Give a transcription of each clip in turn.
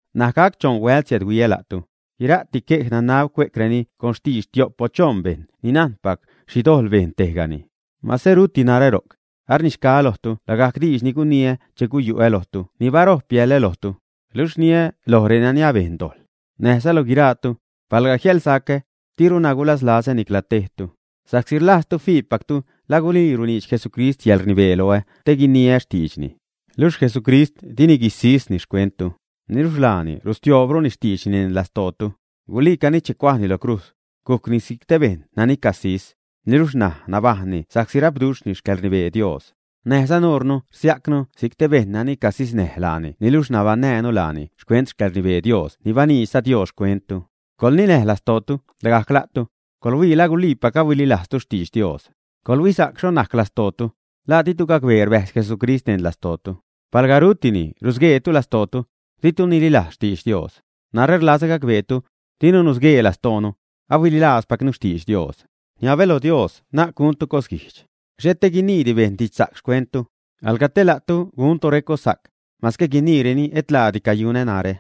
N̲aj gac choṉ huält siädhuiä la'tu. Guira'ti quej nanab cue'creni con xtidx tio'p o choṉ bejṉ ni najnpac xhi dojḻ bejn tejgani. Mase ruti narä ro'c, arnixgaä lojtu lagajc diidx ni guniä che guyu'ä lojtu ni barojp biälä lojtu, luxh rniä loj renani abejn dojḻ, näjza loj guiraatu, palga jiälsacä, diruna gulaslazätu nicla tejtu, sa'csi rlajztu fiipactu la gulii runiidx Jesucrist yäḻrnibee loä te guiniä xtiidxni. Luxh Jesucrist dini guisisni xcuenttu, niluxh laani rustioobruni xtiidxni neṉ lastootu. Guliicani che cuajni lo crujz, gucni si'c te bejṉ nani casis, niluxh ṉaj nabajṉni sa'csi rapduxhni xcäḻrnibee Dios. Näjza nuure rsia'cnu si'c te bejṉ nani casisnäj laani niluxh nabaṉnäjnu laani xcuent xcäḻrnibee Dios ni baniidxza Dios xcuenttu. Coḻninäj lastootu lagajc la'tu, coḻhuii la guliipac ahuililajztu xtidx Dios; coḻhuisa'c xho najc lastootu. ¿La ditu gacbee rbäjz Jesucrist neṉ lastootu, ä? Palga rutini, rusqueetu lastootu, ditu nililajztu xtidx Dios. Narä rlazä gacbeetu, dinu nusguee lastoonu, ahuililajzpacnu xtidx Dios. Rniabä loj Dios na'c guntu cosguijdx, xhet te guiniidi bejṉ didxsa'c xcuentnu, alga te la'tu guntu recossa'c, mase guiniireni et laadi cayunä narä.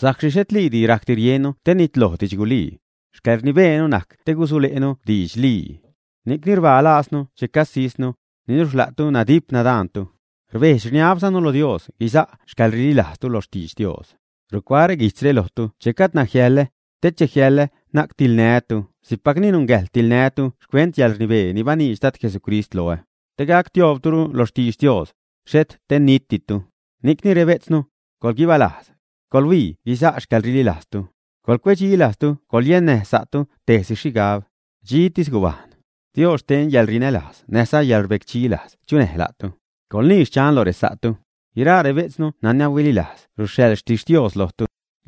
Sa'csi xhetliidi rajcdi riennu te nitloj didxgulii, xcäḻrnibeenu najc te gusule'nu didxlii. Ni'cni rbaa lajznu che casisnu, niluxh la'tu nadip, nadaantu; rbejdx-rniabzanu lo Dios guiza' xcäḻrililajztu lo xtidx Dios. Rucuaä reguijtzre lojtu che gajdna jiäḻä, te che jiäḻä na'c tiḻnää́tu si'cpacni nungäjḻ tiḻnää́tu xcuent yäḻrnibee ni baniidx Dad Jesucrist loä, te gac tioobrutu lo xtidx Dios, xhet te nitditu. Ni'cni rbejtznu, coḻguibalajz, coḻhuii guisa' xcäḻrililajztu, coḻcuecdxi lajztu, coḻyennäj sa'tu tejsi xhigab, dxitis gubajṉ. Dios xten yäḻrinälajz näjza yäḻrbecdxi lajz chunäj la'tu. Coḻnii: “Xchan” lo resa'tu. Guiraa rebejtznu nani ahuililajz ruxhaḻ xtixtios lojtu.